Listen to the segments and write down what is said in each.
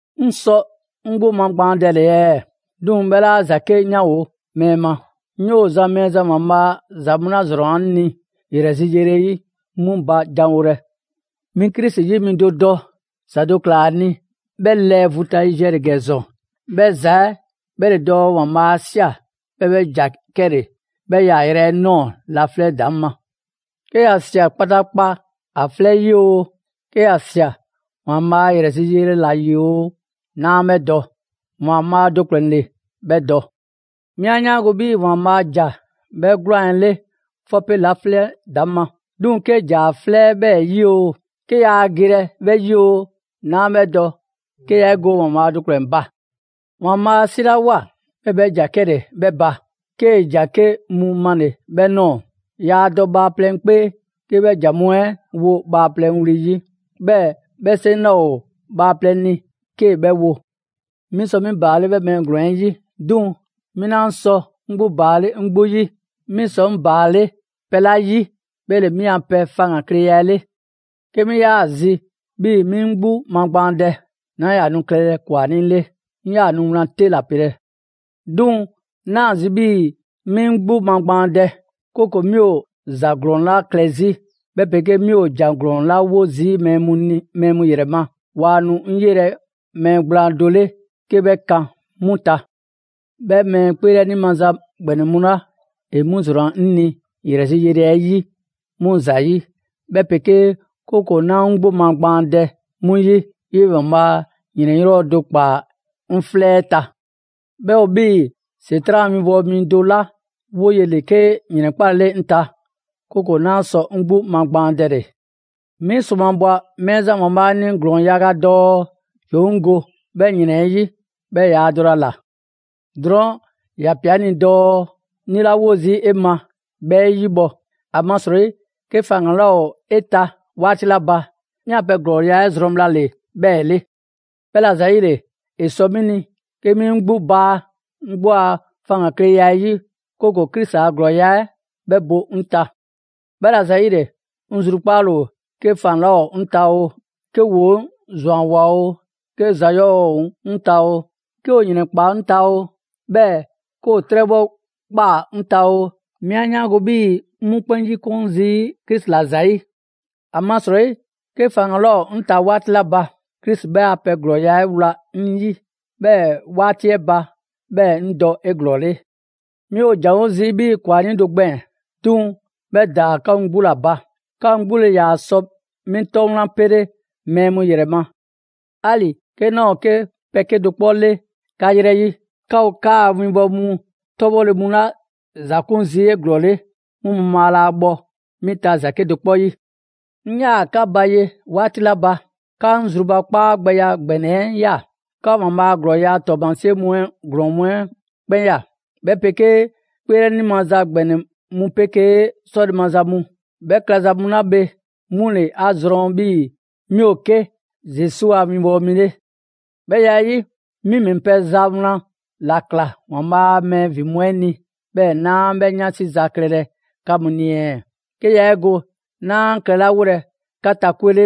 'Ŋ sɔ 'ŋ 'gbu magbaandɛle ɛɛ? 'Duŋ‑ 'bhɛ 'laa ‑za 'ke 'yanwo‑ mɛɛ ma. 'Ŋ 'yoo‑ zan Mɛɛzan ‑Waanbhaa' ‑za mu 'la ‑zrɔnna 'ŋ ni ‑yrɛ zi yele 'yi 'mu ba janwolɛ. 'Mi Krisi 'yi mi do dɔ, ‑za do ꞊kla ‑a ni 'bhɛ lɛɛ vu ta yiziɛ ‑le ‑gɛ ‑zɔn. 'Bhɛ ‑za 'ɛ 'bhɛ ‑le dɔɔ ‑Waanbhaa' 'a ꞊sia, 'bhɛɛ‑ 'bhɛ ‑ja 'kɛle‑ 'bhɛ 'yaayrɛ‑ 'ɛ ꞊nɔɔ laflɛ' ‑daŋ' ma. 'Ke ‑ya ꞊sia kpataakpa ‑a 'flɛ 'ɛ 'yi oo, 'ke ‑ya ꞊sia ‑Waanbhaa' a ‑yrɛ zi yele ‑la ‑yi oo, 'naa 'bhɛ dɔ. ‑Waanbhaa' do ‑kplɛn ‑le 'bhɛ dɔ. 'Mi 'a 'yaango‑ 'bhii‑ ‑Waanbhaa' ‑ja 'bhɛ 'gwlaan‑ 'ɛ 'le 'fɔpe laflɛ' ‑daŋ' ma. 'Duŋ‑ 'kee‑ ‑ja ‑a 'flɛ 'ɛ 'bhɛɛ‑ 'yi oo, 'ke yaa gelɛ 'bhɛ 'yi oo, 'naa 'bhɛ dɔ 'ke yaa 'e go ‑Waanbhaa' do ‑kplɛn ba. ‑Waanbhaa' 'a 'silawoa, 'bhɛɛ‑ 'bhɛ ‑ja 'kɛle‑ 'bhɛ ba, 'kee‑ ‑jan 'ke mu male‑ 'bhɛ ꞊nɔɔ: yaa dɔ bhaaplɛŋ 'kpee 'kee‑ 'bhɛ ‑jan mu 'ɛ wo bhaaplɛŋ wli 'yi, 'bhɛɛ‑ 'bhɛ 'seŋ 'laa ‑o bhaaplɛŋ ni 'kee‑ 'bhɛ wo. 'Mi sɔ 'mi ‑baale' 'bhɛɛ‑ mɛɛ ‑glɔɔn 'ɛ 'yi; 'duŋ‑ 'mi 'naa sɔ 'ŋ ‑baale' 'ŋ 'gbu 'yi. 'Mi sɔ 'ŋ ‑baale' pɛ 'la 'yi 'bhɛ ‑le 'mi a pɛ faŋgankleya 'ɛ 'le. 'Ke 'mi 'yaa‑ zi 'bhii‑ 'mi 'ŋ 'gbu magbaandɛ, 'naa ‑yaa nu klɛlɛ ‑kwanii' 'le, 'ŋ 'yaa‑ nu wlan 'te ‑la pelɛ. 'Duŋ‑ 'naa ‑a zi 'bhii‑ 'mi 'ŋ 'gbu magbaandɛ, 'kooko‑ 'mi ‑o ‑za ‑glɔɔn 'la klɛ 'zi, 'bhɛ 'pegee 'mi ‑o ‑jan ‑glɔɔn 'la 'wo zii' mɛɛ mu ‑yrɛ ma, waa nu 'ŋ 'yelɛ‑ mɛɛ gblaan do 'le 'ke 'bhɛ kan 'mu ta. 'Bhɛ mɛɛ 'kpeelɛni maza ‑gbɛnɛ mu 'la ‑e 'mu ‑zrɔnna 'ŋ ni ‑yrɛ zi yele 'ɛ 'yi 'mu ‑zayi', 'bhɛ 'pegee, 'kooko‑ 'naa 'ŋ 'gbu magbaandɛ 'mu 'yi, 'yee‑ ‑Waanbhaa' ‑yrɛn 'yɔɔ‑ do ꞊kpaa 'ŋ 'flɛ 'ɛ ta; 'bhɛ ‑o 'bhii‑ ‑Setran' a winbɔwo mi do 'la 'woye‑ ‑le 'ke ‑yrɛnkpalele 'ŋ ta, 'kooko‑ 'naa sɔ 'ŋ 'gbu magbaandɛle. 'Mi ‑sromabwa Mɛɛzan ‑Waanbhaa' ni ‑glɔɔn yaga dɔɔ ‑yoo 'ŋ go 'bhɛ ‑yrɛn 'ɛ 'yi; 'bhɛɛ‑ ‑yaa dɔlɛ ‑a ꞊la. Drɔɔn' ‑ya ꞊pia 'ŋ ni dɔɔ: «'Ŋ lilawo zii' 'e ma, 'bhɛ 'e 'yibhɔ‑, ‑amasrɔyi 'ke faŋgan‑ 'laa ‑o 'e ta 'waati 'la ba, 'mi a pɛ ‑glɔɔya' 'ɛ zrɔn bhla ‑le 'bhɛɛ‑ 'le.» 'Bhɛla‑ ‑zayile, ‑e sɔ 'mi ni 'ke 'mi 'ŋ 'gbu baa 'ŋ 'gbu a faŋgankleya 'ɛ 'yi, 'kooko‑ Krisi a ‑glɔɔya' 'ɛ 'bhɛ bo 'ŋ ta. 'Bhɛla‑ ‑zayile, 'ŋ zrukpaale ‑o 'ke faŋgan‑ 'laa ‑o 'ŋ ta oo, 'ke ‑woo 'ŋ ‑zwanwoa oo, 'ke ‑za ‑glɔɔ ‑o 'ŋ ta oo, 'ke ‑o ‑yrɛnkpaa 'ŋ ta oo, 'bhɛɛ‑ 'ke ‑o 'trɛbhɔ ꞊kpaa 'ŋ ta oo, 'mi 'a 'yaango‑ 'bhii‑ 'ŋ 'mu 'kpɛn 'yikun zii' Krisi ‑la ‑zayi'. ‑Amasrɔyi 'ke faŋgan‑ 'laa ‑o 'ŋ ta 'waati 'la ba, Krisi 'bhɛ a pɛ ‑glɔɔya' 'ɛ wla 'ŋ 'yi, 'bhɛɛ‑ 'waati 'ɛ ba, 'bhɛɛ‑ 'ŋ dɔ 'eglɔɔle. 'Mi ‑o ‑janwo' zii' 'bhii‑ ‑kwanii' do gbɛɛn‑! 'Duŋ‑ 'bhɛ ‑daa 'ka mu 'gbu ‑la ba. 'Ka mu 'gbu ‑le ‑yaa sɔ 'mi 'tɔ wlan pele‑ mɛɛ mu ‑yrɛ ma. 'Ali‑ 'ke 'naa ‑o 'ke pɛ 'kedo‑ 'kpɔ 'le 'ka 'yrɛ 'yi, 'ka ‑o 'kaa‑ winbɔwo mu 'tɔbhɔle mu 'la ‑za 'kun zii' 'eglɔɔle, 'mu mabhaa laa bhɔ 'mi ta ‑za 'kedo‑ 'kpɔ 'yi. 'Ŋ 'yaa‑ 'ka ba ye 'waati 'la ba, 'ka 'ŋ zrubakpaagbɛya ‑gbɛnɛ 'ɛ ꞊ya. 'Ka ‑Waanbhaa' a ‑glɔɔya' 'ɛ 'tɔɔmasie mu 'ɛ ‑glɔɔn 'ɛ 'kpɛn ꞊ya, 'bhɛ 'pegee 'kpeelɛni maza ‑gbɛnɛ mu 'pegee 'sɔle‑ maza mu. 'Bhɛ klɛza mu 'la bhe, 'mu ‑le 'a zrɔn 'bhii‑ 'mi ‑o 'ke Zesu a 'winbɔwo mi 'le. 'Bhɛ ya 'ɛ 'yi, 'mi ‑mɛ pɛ ‑za 'wlan ‑la ꞊kla ‑Waanbhaa' a mɛɛ ‑vin mu 'ɛ ni, 'bhɛɛ‑ 'naa 'bhɛ 'yansi za klɛlɛ 'ka mu ni ɛɛ? 'Ke yaa 'e go 'naa klɛlawolɛ 'ka ta 'kwe 'le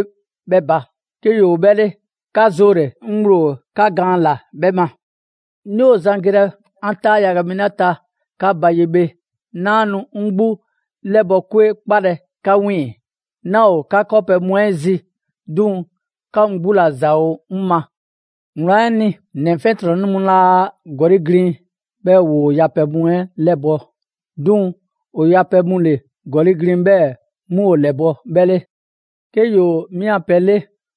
'bhɛ ba. 'Ke ‑yoo 'bhɛ 'le, 'ka 'zoole‑, 'ŋ ŋgblo ‑o 'ka gaan ‑la 'bhɛ ma. 'Mi ‑o zan gelɛ 'an 'taa yaga mi 'la ta 'ka ba ye bhe, 'naa nu 'ŋ 'gbu 'lɛbɔ‑ 'kwe 'kpalɛ‑ 'ka 'wiiŋ‑. 'Naa ‑o 'ka 'kɔɔpɛ‑ mu 'ɛ zi, 'duŋ‑ 'ka mu 'gbu ‑la ‑za ‑o 'ŋ ma. Wlan 'ɛ ni, ‑nɛ 'fiɛntrɔnnɛ mu 'laa ‑gɔli' glin 'bhɛɛ‑ ‑woo yapɛ mu 'ɛ 'lɛbɔ‑; 'duŋ‑ ‑o yapɛ mu ‑le ‑gɔli' glin 'bhɛɛ‑ 'mu ‑o ‑lɛbɔ' 'bhɛ 'le. 'Ke ‑yoo 'mi a pɛ 'le,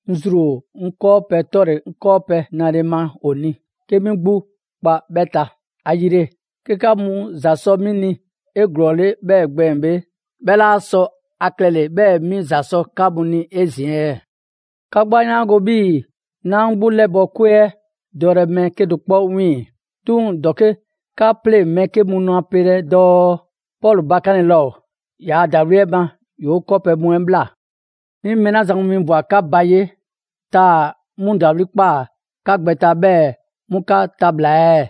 'ŋ zru ‑o 'ŋ 'kɔɔpɛ‑ 'tɔle‑ 'ŋ 'kɔɔpɛ‑ nale ma ‑o ni, 'ke 'mi 'gbu kpa 'bhɛ ta. ‑Ayile, 'ke 'ka mu ‑za sɔ 'mi ni 'eglɔɔle 'bhɛ gbɛɛn‑ bhe, 'bhɛ 'laa sɔ ‑a klɛle‑ 'bhɛɛ‑ 'mi ‑za sɔ 'ka mu ni 'ezin‑ ɛɛ? 'Ka 'gbu 'a 'yaango‑ 'bhii‑ 'naa 'ŋ 'gbu 'lɛbɔ‑ 'kwe 'ɛ dɔlɛ mɛɛ 'kedo‑ 'kpɔ 'wiiŋ‑. 'Duŋ‑ ‑dɔke' 'ka 'pleŋ‑ mɛɛ 'ke mu nu ‑a pelɛ dɔɔ: «Pɔlu bakanle laa ‑o! ‑Yaa' ‑dawliya 'ɛ ma, ‑yoo' 'kɔɔpɛ‑ mu 'ɛ ꞊bhla.» 'Mi mɛɛ 'la zan mu winbwa‑ 'ka ba ye, taa‑ 'mu ‑dawli' ꞊kpaa 'ka gbɛ ta, 'bhɛɛ‑ 'mu 'ka tabhla‑ ɛɛ?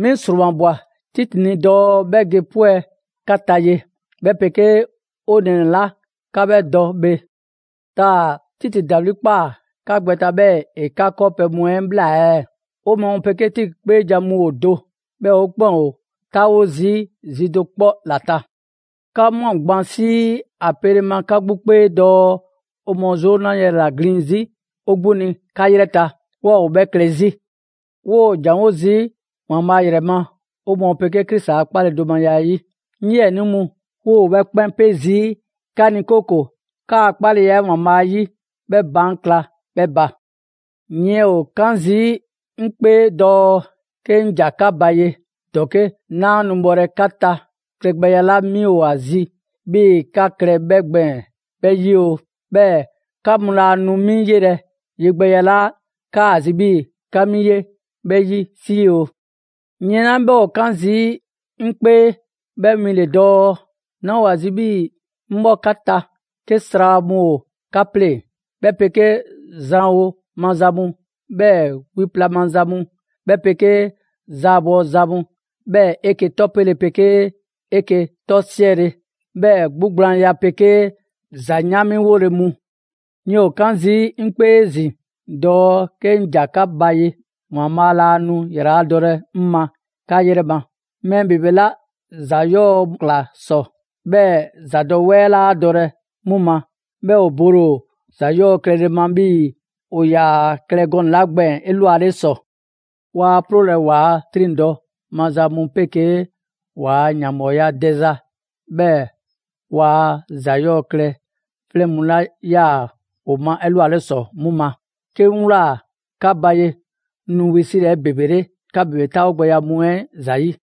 'Mi ‑sromabwa Titi ni dɔɔ 'bhɛ ge 'pwɛ‑ 'ka ta ye, 'bhɛ 'pegee 'o nɛɛnɛ‑ 'la 'ka 'bhɛ dɔ bhe. Taa‑ Titi ‑dawli' ꞊kpaa 'ka gbɛ ta 'bhɛɛ‑ ‑e 'ka 'kɔɔpɛ mu 'ɛ ꞊bhla ɛɛ? 'O mɔɔ 'pegee Titi 'kpeejan‑ mu ‑o do; 'bhɛɛ‑ 'o 'kpɛn ‑o 'taawo zii' zi do 'kpɔ ‑la ta. 'Ka ꞊mwa gban 'sii ‑a pele ma 'ka 'gbu 'kpee dɔɔ 'o mɔɔ 'zoo 'na yrɛ ‑la ‑glin 'zi 'o 'gbu ni 'ka 'yrɛ ta; 'waa ‑o 'bhɛ klɛ 'zi. 'Woo ‑janwo' zii' ‑Waanbhaa' ‑yrɛ ma 'o mɔɔ 'pegee Krisi a 'kpaledomaya 'ɛ 'yi. 'Ŋ 'yiɛnii mu, 'woo‑ 'bhɛ 'kpɛn 'pe zii' 'ka ni 'kooko‑ 'kaa‑ 'kpaleya 'ɛ ‑Waanbhaa' 'yi 'bhɛ baan' kla 'bhɛ ba. Yiɛn ‑o 'kan zii' 'mi 'kpee dɔɔ 'ke 'ŋ ‑ja 'ka ba ye, ‑dɔke' 'naa nu bhɔlɛ 'ka ta klɛgbɛya 'la 'mi ‑o ‑a zi 'bhii‑ 'ka klɛ 'bhɛ gbɛɛn‑ 'bhɛ 'yi oo, 'bhɛɛ‑ 'ka mu laa nu 'mi 'yelɛ‑ yegbɛya 'la 'kaa‑ zi 'bhii‑ 'ka 'mi 'ye 'bhɛ 'yi 'sii oo. Yiɛn 'la 'bhɛ ‑o 'kan zii' 'ŋ 'kpee 'bhɛ win ‑le dɔɔ, 'naa ‑o ‑a zi 'bhii‑ 'ŋ 'bhɔ 'ka ta 'ke sra mu ‑o 'ka 'pleŋ‑, 'bhɛ 'pegee zranwo maza mu, 'bhɛɛ‑ wiya plaza mu, 'bhɛ 'pegee zaabɔ za mu, 'bhɛɛ‑ 'eke‑ 'tɔpele 'pegee 'eke‑ 'tɔsiɛle, 'bhɛɛ‑ 'gbugblaanya 'pegee ‑za 'yaanmiwole mu. Yiɛn ‑o 'kan zii' 'ŋ 'kpee 'ezin‑ dɔɔ 'ke 'ŋ ‑ja 'ka ba ye, ‑Waanbhaa' laa nu ‑yraladɔlɛ 'ŋ ma 'ka 'yrɛ ma. Mɛɛ ‑bebe 'la ‑za 'yɔɔ‑ ꞊kla ‑sɔ, 'bhɛɛ‑ ‑zadɔwɛɛ 'laa dɔlɛ 'mu ma, 'bhɛɛ‑ ‑o bole ‑o ‑za 'yɔɔ‑ klɛle ma 'bhii‑ ‑o ‑yaa klɛ gɔnɛ‑ 'la gbɛɛn‑ 'elwale ‑sɔ. Waa 'ploolɛ ‑waa' 'triŋdɔ‑ maza mu 'pegee ‑waa' ‑yanbhɔɔya dɛza, 'bhɛɛ‑ waa ‑za 'yɔɔ‑ klɛ 'flɛn mu 'la 'yaa‑ ‑o ma 'elwale ‑sɔ 'mu ma; 'kee 'ŋ ꞊wlaa 'ka ba ye 'ŋ nu wisilɛ 'ebebele 'ka ‑bebe 'taawogbɛya mu 'ɛ ‑zayi'.